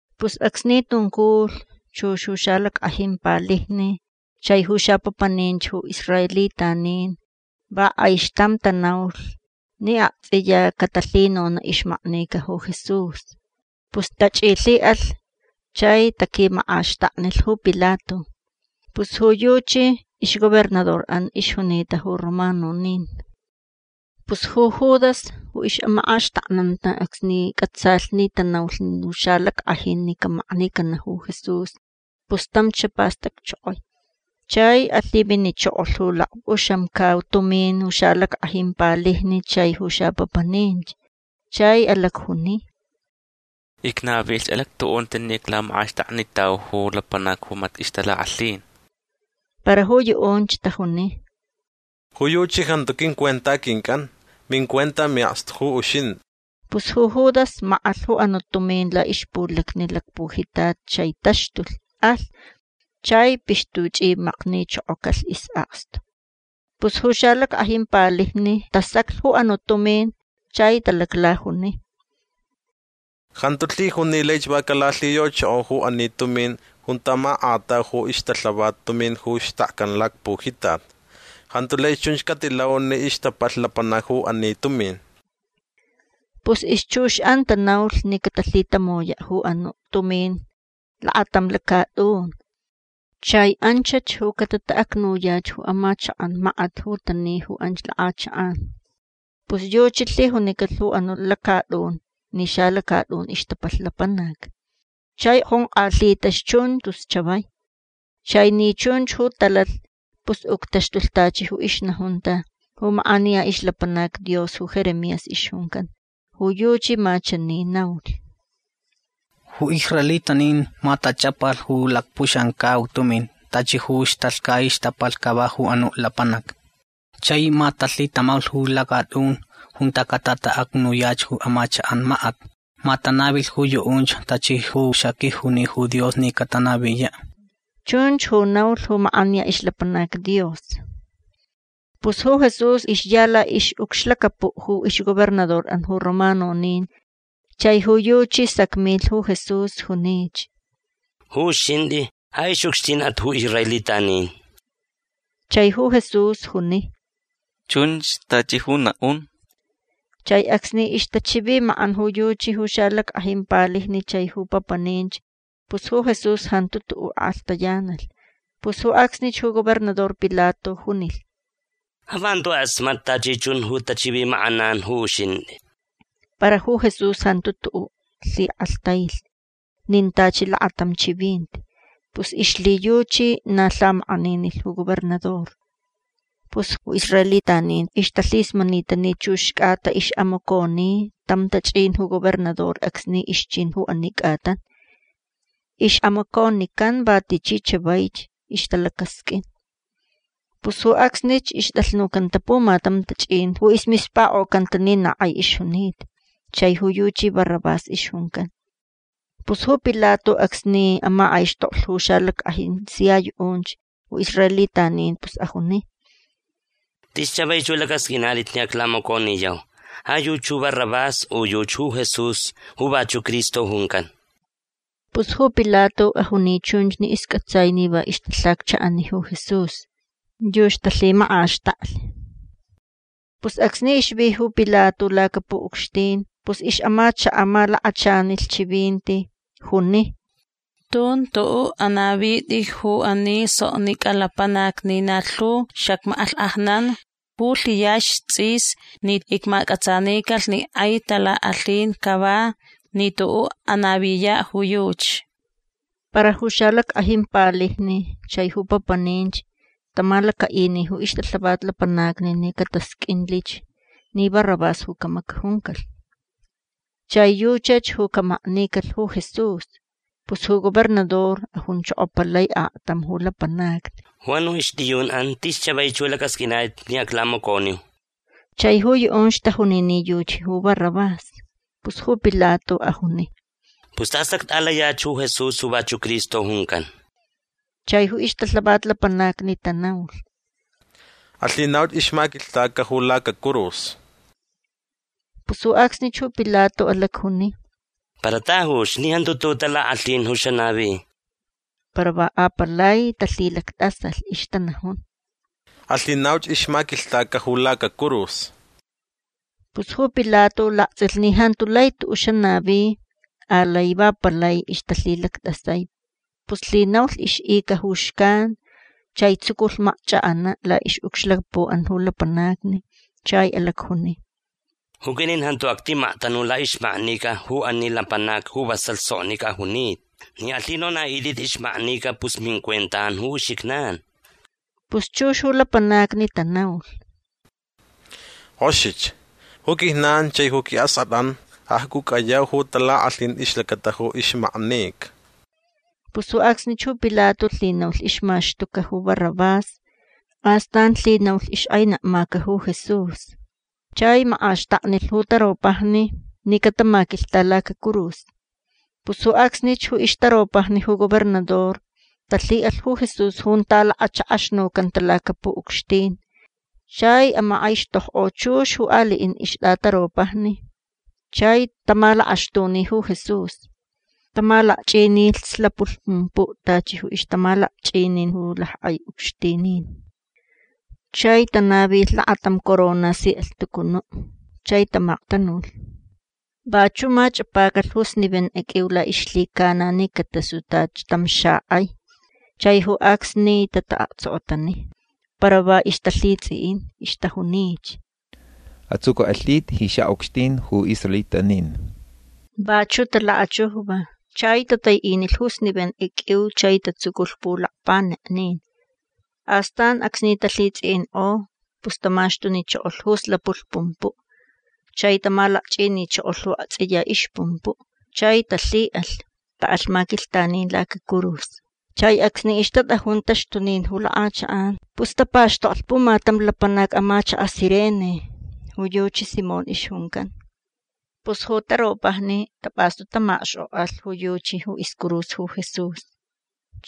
Pus acsni tunculh chux ju xalack'ajin palijni chai ju xapapaninch ju israelitanin va k'aixtam tanaulh ni akts'iya catalhinona' ixmaknica ju Jesús. Pus tach'ilhi'alh chai taquimak'axtaknilh ju Pilato. Pus ju yuchi ixgobernador'an ixjunita ju romanonin. Pus ju Judas ju ix'amak'axtaknanta acsni c'atsalh ni tanaulh ju xalack'ajin ni camaknicana' ju Jesús pus tam xapastacchokoi. Chai alhiminichokolh ju lakp'uxamcau tumin ju xalack'ajin palijni chai ju xapapaninch. Chai alacjuni: ―Icnavilh alactu'unti ni iclamak'axtaknitau ju lapanac ju mati' ixtalak'alhin. Para ju yu'unch tajuni: ―Ju yuchi jantu quincuenta quinc'an. Mincuenta mi'akstu ju uxint'i. Pus ju Judas mak'alh ju anu' tumin la'ixpulacni lacpujitat chai taxtulh. Alh. Chai pixtuch'imaknichokocalh is'akstu. Pus ju xalack'ajin palijni tasaclh ju anu' tumin chai talaclajuni: ―Jantu lhijun ni laich va calalhiyochoko ju ani tumin junta mak'atau ju ixtalhavat tumin ju xtakcan lacpujitat. Jantu lai chunch catilau ni ixtapalhch lapanac ju ani tumin. Pus ixchux'an tanaulh ni catalhitamoya' ju anu' tumin lakatam lacat'un. Chai anchach ju catata'acnuyach ju amachak'an makat ju tani ju anch lak'achak'an. Pus yuchi lhijunicalh ju anu' lacat'un ni xalacat'un ixtapalh lapanac. Chai jonk'alhitach chun tus chavai. Chai ni chunch ju talalh pus uctaxtulh tachi ju ixnajunta ju mak'aniya ixlapanac Dios ju Jeremías ixjuncan. Ju yuchi ma chani naulh: “Ju israelitanin ma tach'apalh ju lakp'uxamcau tumin tachi ju ixtalhcaich ixtapalhch cava ju anu' lapanac. Chai ma talhitamaulh ju lacat'un junta catata'acnuyach ju amachak'an makat. Ma tanavilh ju yu'unch tachi ju xaquijuni ju Dios ni catanaviya'”. Chunch ju naulh ju mak'aniya ixlapanac Dios. Pus ju Jesús ixya la'ix'ucxlacapu' ju ixgobernador'an ju romanonin. Chai ju yuchi sacmilh ju Jesús. Junich: ―Ju uxint'i ja ix'ucxtin'at ju israelitanin. Chai ju Jesús juni: ―Chunch tachi ju na'un. Chai acsni ixtachivimak'an ju yuchi ju xalack'ajin palijni chai ju papaninch pus ju Jesús jantu tu'u' ak'alhtayanalh. Pus ju acsnich ju gobernador Pilato junilh: ―Ja va jantu k'asmat'i tachi chun ju tachivimak'anan ju uxint'i. Para ju Jesús jantu tu'u' lhik'alhtailh nin tachi lakatam chivinti. Pus ixlhiyuchi na lhamak'aninilh ju gobernador. Pus ju israelitanin ixtalhismanita ni chux c'ata ix'amaconi tam tach'in ju gobernador acsni ixchin ju ani c'atan. Ix'amaconican va tichi chavaich ixtalacasq'uin. Pus ju acsnich ixt'alhnucanta pumatam tach'in ju ismispak'ocanta ni na k'ai ixjunita. Chai ju yuchi Barrabás ixjuncan. Pus ju Pilato acsni amak'aixtoklh ju xalack'ajin sia yu'unch ju israelitanin pus ajuni: ―Tis chavaich ju lac'asq'uinat'it ni aclamaconiyau. Ja yuchi ju Barrabás u yuchi ju Jesús ju vachu' Cristo juncan. Pus ju Pilato ajuni chunch ni isc'atsai ni va ixtalhaccha'ani ju Jesús. Yuchi talhimak'axtaklh. Pus acsni ixvi ju Pilato lacapu'ucxtin pus ix'amachaka' malakachanilh chivinti. Juni: “Tun tu'u' anavit'i ju ani soknic'a lapanac ni na lhu xacmak'alhk'ajnan ju lhiyaxch ts'is ni icmac'atsanicalh ni k'ai talak'alhin cava ni tu'u' anaviya' ju yuchi”. Para ju xalack'ajin palijni chai ju papaninch tamalaca'ini ju ixtalhavat lapanacni ni catasq'uinlich ni Barrabás ju camacajuncalh. Chai yuchach ju camaknicalh ju Jesús. Pus ju gobernador ajunchokopalai aktam ju lapanacni: ―Ju anu' ixt'iyun'an tis chavaich ju lac'asq'uinat'it ni aclamacaulh. Chai ju yu'unch tajuni ni yuchi ju Barrabás. Pus ju Pilato ajuni: ―Pus tas act'alayach ju Jesús ju vachu' Cristo juncan. Chai ju ixtalhavat lapanacni tanaulh: ―Alhinauch ixmaquilhtaca ju lacacurus. Pus ju acsnich ju Pilato alacjuni: ―Para tajuch ni jantu tu'u' talak'alhin ju xanavi. Para va apalai talhilact'asalh. Ixtanajun: ―Alhinauch ixmaquilhtaca ju lacacurus. Pus ju Pilato lakts'ilh ni jantu lai tu'u' xanavi. Alai va palai ixtalhilact'asai. Pus lhinaulh ix'ica ju xcan. Chai tsuculh makch'ak'ana' la'ix'ucxlacapu'an ju lapanacni. Chai alacjuni: ―Ju quit'in jantu actimaktanu la'ixmaknica ju ani lapanac ju vasalh soknic'a junita. Ni alhinona'it'it ixmaknica pus mincuenta'an ju uxijnan. Pus chux ju lapanacni tanaulh: ―K'oxich. Ju quijnan chai ju qui'ask'at'an acc'uc'ayau ju talak'alhin ixlacata ju ixmaknica. Pus ju acsnich ju Pilato lhinaulh ixmaxtuca ju Barrabás. Astan lhinaulh ixk'ainekmaca ju Jesús. Chai mak'axtaknilh ju taropajni ni catamaquilhta lacacurus. Pus ju acsnich ju ixtaropajni ju gobernador talhi'alh ju Jesús junta lakachak'axnucanta lacapu'ucxtin. Chai amak'aixtokk'o chux ju ali'in ixt'ataropajni. Chai tamalakaxtuni ju Jesús. Tamalakch'inilh slapulh pumpu' tachi ju ixtamalakch'inin ju lack'ai ucxtinin. Chai tanavilh lakatam corona si alhtucunu' chai tamaktanulh. Vachu' mach'apacalh ju snivenk'e q'uiu la'ixlhicana ni catasu tachi tam xak'ai. Chai ju acsni tata'aktsokotani. Para va ixtalhits'i'in. Ixtajunich: ―Ats'uc'uk'alhit'i ji xa'ucxtin ju israelitanin. Vachu' talakachujva. Chai tatai'inilh ju snivenk'e q'uiu chai tatsuculh pulakpaneknin. Astan acsni talhits'i'ink'o pus tamaxtunichokolh ju slapulh pumpu'. Chai tamalakch'inichokolh ju akts'iya ixpumpu'. Chai talhi'alh. Ta'alh maquilhtanin lacacurus. Chai acsni ixtat'ajun taxtunin ju lak'achak'an pus tapakxtoklh pumatam lapanac amachaka' Cirene. Ju yuchi Simón ixjuncan. Pus ju taropajni tap'astu tamakxk'ok'alh ju yuchi ju iscurus ju Jesús.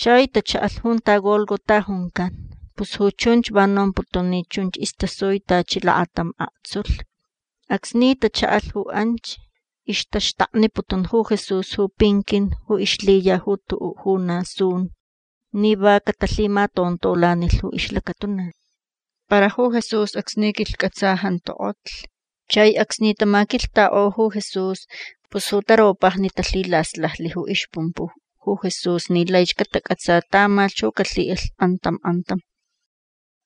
Chai tacha'alh junta Gólgota juncan. Pus ju chunch va nomputun ni chunch istasui tachi lakatam aktsulh. Acsni tacha'alh ju anch ixtaxtakniputun ju Jesús ju pinquin ju ixlhiya ju tu'u' ju na sun ni va catalhimatontolanilh ju ixlacatuna. Para ju Jesús acsni quilhc'atsa jantu k'otlh. Chai acsni tamaquilhtak'o ju Jesús pus ju taropajni talhilaslajlh ju ixpumpu' ju Jesús ni laich catac'atsa tamalhch ju calhi'alh k'antam k'antam.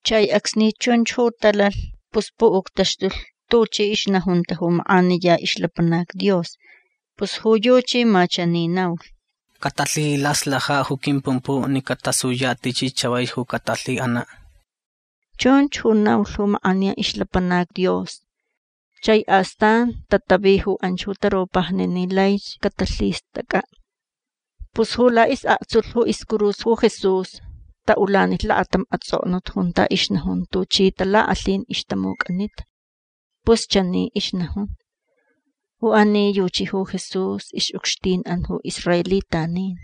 Chai acsni chunch ju talalh pus pu'uctaxtulh tuchi ixnajunta ju mak'aniya ixlapanac Dios. Pus ju yuchi ma chani naulh: “Catalhilaslaja' ju quimpumpu' ni catasuya' tichi chavaich ju catalhi'ana'”. Chunch ju naulh ju mak'aniya ixlapanac Dios. Chai astan tatavi ju anch ju taropajni ni laich catalhist'ac'a'. Pus ju la'is'aktsulh ju iscurus ju Jesús ta'ulanilh lakatam ats'oknut junta ixnajun tuchi talak'alhin ixtamuc'anita. Pus chani ixnajun: “Ju ani yuchi ju Jesús. Ix'ucxtin'an ju israelitanin”.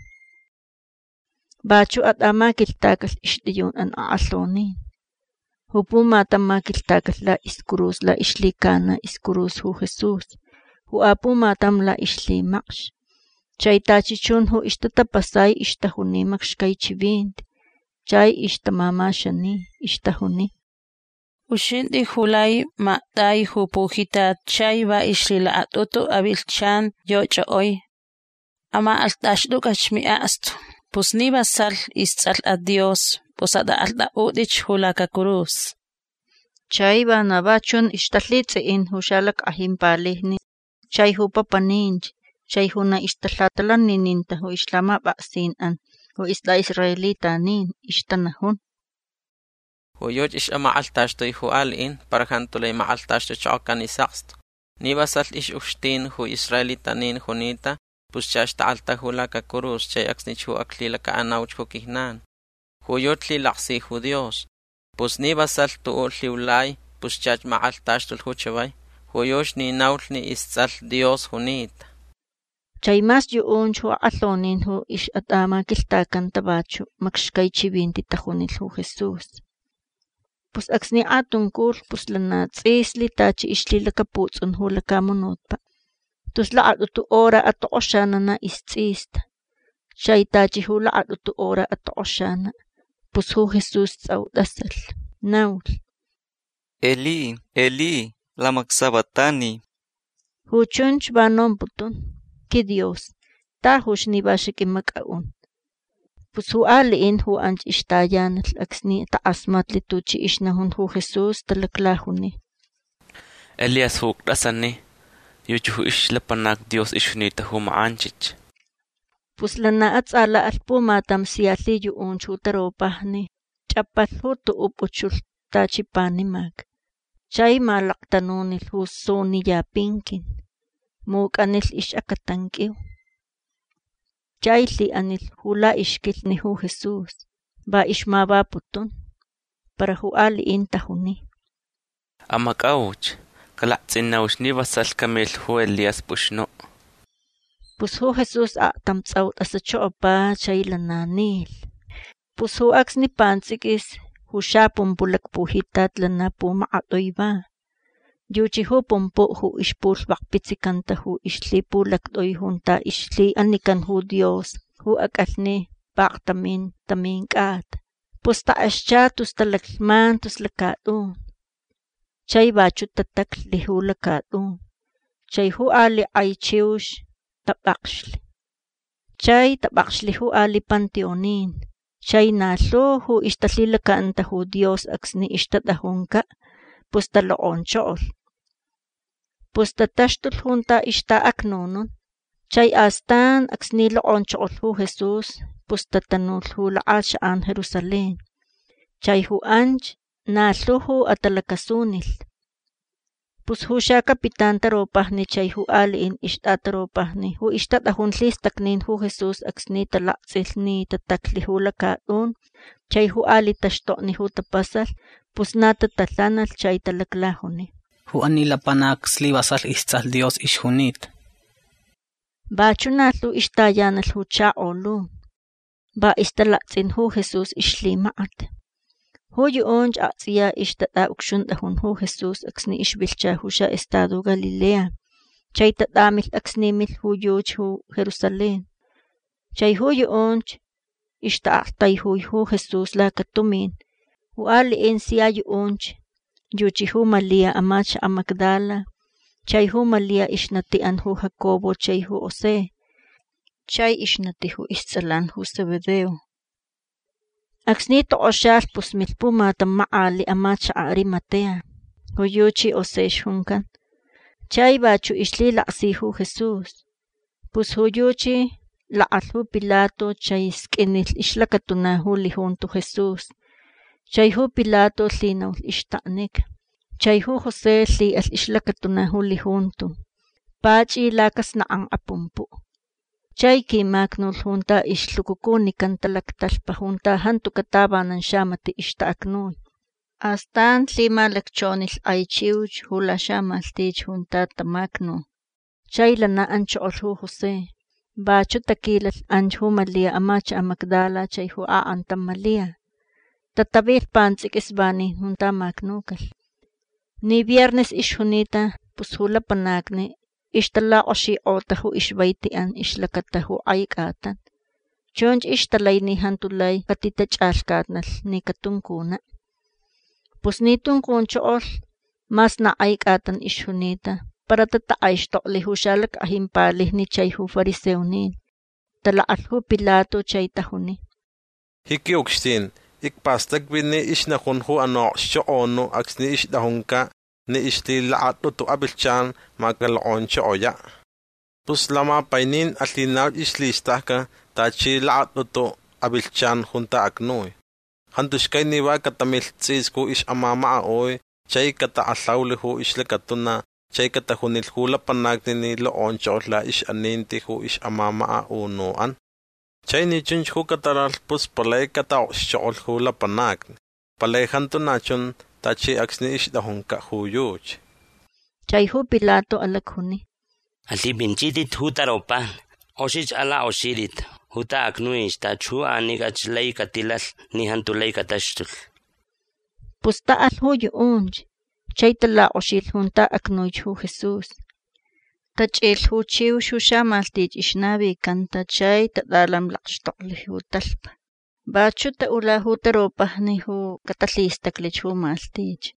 Vachu' at'amaquilhtacalh ixt'iyun'an ak'alhonin. Ju pumatam maquilhtacalh la'iscurus la'ixlhicana iscurus ju Jesús. Ju apumatam la'ixlhimacx. Chai tachi chun ju ixtatapasai ixtajuni macxcai chivinti. Chai ixtamamaxani. Ixtajuni: ―Uxint'i ju lai makt'ai ju pujitat chai va ixlhilakat'utu avilhchan yoch'ok'oi. Amak'alht'axt'uc'ach mi'akstu. Pus ni vasalh ists'alh'at Dios pus at'ak'alht'a'ut'ich ju lacacurus. Chai vana va chun ixtalhits'i'in ju xalack'ajin palijni chai ju papaninch chai ju na ixtalhatalanininta ju ixlhamap'aksin'an ju ist'a'israelitanin. Ixtanajun: ―Ju yuchi ix'amak'alhtaxtui ju ali'in para jantu lai mak'alhtaxtuchokocan is'akstu. Ni vasalh ix'ucxtin ju israelitanin junita pus chach tak'alhtaju lacacurus chai acsnich ju aclhilaca'anauch ju quijnan. Ju yuchi lhilaksi ju Dios. Pus ni vasalh tu'u' lhiulai pus chach mak'alhtaxtulh ju chavai. Ju yuchi ni naulh ni ists'alh Dios junita. Chai mas yu'unch ju ak'alhonin ju ix'at'amaquilhtacanta vachu' macxcai chivinti tajunilh ju Jesús. Pus acsni k'atunculh pus lana ts'islh tachi ixlhilacaputs'un ju lacamunutpa'. Tus lakat'utu hora atok'oxana' na ists'ista. Chai tachi ju lakat'utu hora atok'oxana' pus ju Jesús ts'au t'asalh. Naulh: ―Elí, Elí, lama sabactani. Ju chunch va nomputun: QuiDios tajuch ni va xaq'uimac'a'un. Pus ju ali'in ju anch ixtayanalh acsni tak'asmatlh tuchi ixnajun ju Jesús talaclajuni: ―Elías ju t'asani. Yuchi ju ixlapanac Dios ixjunita ju mak'anchich. Pus lana ats'ala'alh pumatam sia lhiyu'unch ju taropajni. Ch'apalh ju tu'u' p'uch'ulh tachi panimac. Chai malaktanunilh ju suniya pinquin. Muc'anilh ix'acatan q'uiu. Chai lhi'anilh ju la'ixquilhni ju Jesús. Va ixmavaputun. Para ju ali'in tajuni: ―Amac'auch. Calakts'inauch ni vasalh camilh ju Elías p'uxnu'. Pus ju Jesús aktam ts'au t'asachokopa chai lana nilh. Pus ju acsni pants'iquis ju xapumpu' lacpujitat lana pumakat'ui va. Yuchi ju pumpu' ju ixpulhvakpitsicanta ju ixlhipulact'ui junta ixlhi'anican ju Dios ju ac'alhni paktamin tamin c'ata. Pus tak'excha tus talaclhman tus lacat'un. Chai vachu' tataclh ju lacat'un. Chai ju ali' k'ai chiux tap'akxlh. Chai tap'akxlh ju ali' panteonin. Chai na lhu ju ixtalhilaca'anta ju Dios acsni ixtat'ajunca' pus talok'onchokolh. Pus tataxtulh junta ixta'acnunun. Chai astan acsni lok'onchokolh ju Jesús pus tatanulh ju lak'achak'an Jerusalén. Chai ju anch na lhu ju atalac'asunilh. Pus ju xacapitán taropajni chai ju ali'in ixt'ataropajni ju ixtat'ajun lhistacnin ju Jesús acsni talakts'ilh ni tataclh ju lacat'un chai ju ali' taxtokni ju tapasalh pus na tatalhanalh chai talaclajuni: ―Ju ani lapanac islivasalh ists'alh Dios ixjunita. Vachu' na lhu ixtayanalh ju chakolun. Va ixtalakts'in ju Jesús ixlhimakat. Ju yu'unch akts'iya ixtat'a'ucxunt'ajun ju Jesús acsni ixvilhcha ju xa'estado Galilea chai tat'amilh acsni milh ju yuchi ju Jerusalén. Chai ju yu'unch ixta'aktaijui ju Jesús lacatumin. Ju ali'in sia yu'unch yuchi ju Malia amachaka' Magdala. Chai ju Malia ixnati'an ju Jacobo chai ju José. Chai ixnati ju ists'alan ju Zebedeo. Acsni tok'oxalh pus milh pumatam mak'ali' amachaka' Arimatea. Ju yuchi José ixjuncan. Chai vachu' ixlhilaksi ju Jesús. Pus ju yuchi lak'alh ju Pilato chai sq'uinilh ixlacatuna ju lijunto Jesús. Chai ju Pilato lhinaulh ixtaknica. Chai ju José lhi'alh ixlacatuna ju lijunto. Pach'i lacasnak'ank'a pumpu'. Chai quimacnulh junta ixlhucucunicanta lactalhpa junta jantuca' tavanan xamati' ixta'acnui. Astan lhimalacchonilh k'ai chiux ju laxamalhtich junta tamacnu. Chai lana anchokolh ju José. Vachu' taquilalh anch ju Malia amachaka' Magdala chai ju ak'antam Malia. Tatavilh pants'iquis vanin junta macnucalh. Ni viernes ixjunita pus ju lapanacni ixtalak'oxik'ota ju ixvaiti'an ixlacata ju k'ai c'atan. Chunch ixtalai ni jantu lai catitach'alhcatnalh ni catuncuna'. Pus ni tuncunchokolh mas na k'ai c'atan ixjunita para tatak'aixtokli ju xalack'ajin palijni chai ju fariseonin. Talak'alh ju Pilato. Chai tajuni: ―Ji qui'ucxtin icpastacvi ni ixnajun ju anu' a'okxchok'onu' acsni ixt'ajunca' ni ixlhilakat'utu avilhchan ma calok'onchokoya'. Pus lamapainin alhinauch ixlhist'ac'a tachi lakat'utu avilhchan junta acnui. Jantu xcai ni va catamilh ts'is ju ix'amamaka'ui chai catak'alhaulh ju ixlacatuna chai catajunilh ju lapanacni ni lok'onchokolh la'ix'aninti ju ix'amamaka'unu'an. Chai ni chunch ju catalalh pus palai cata'okxchok'olh ju lapanacni. Palai jantu na chun tachi acsni ixt'ajunca' ju yuchi. Chai ju Pilato alacjuni: ―Alhip'inchit'it ju taropajni. K'oxich alak'oxit'it junta acnuich tachi ju anic'ach lai catilalh ni jantu lai cataxtulh. Pus ta'alh ju yu'unch. Chai talak'oxilh junta acnuich ju Jesús. Tach'ilh ju chiux ju xamalhtich ixnavicanta chai tat'alamlakxtoklh ju talhpa. Vachu' ta'ula ju taropajni ju catalhistaclich ju malhtich.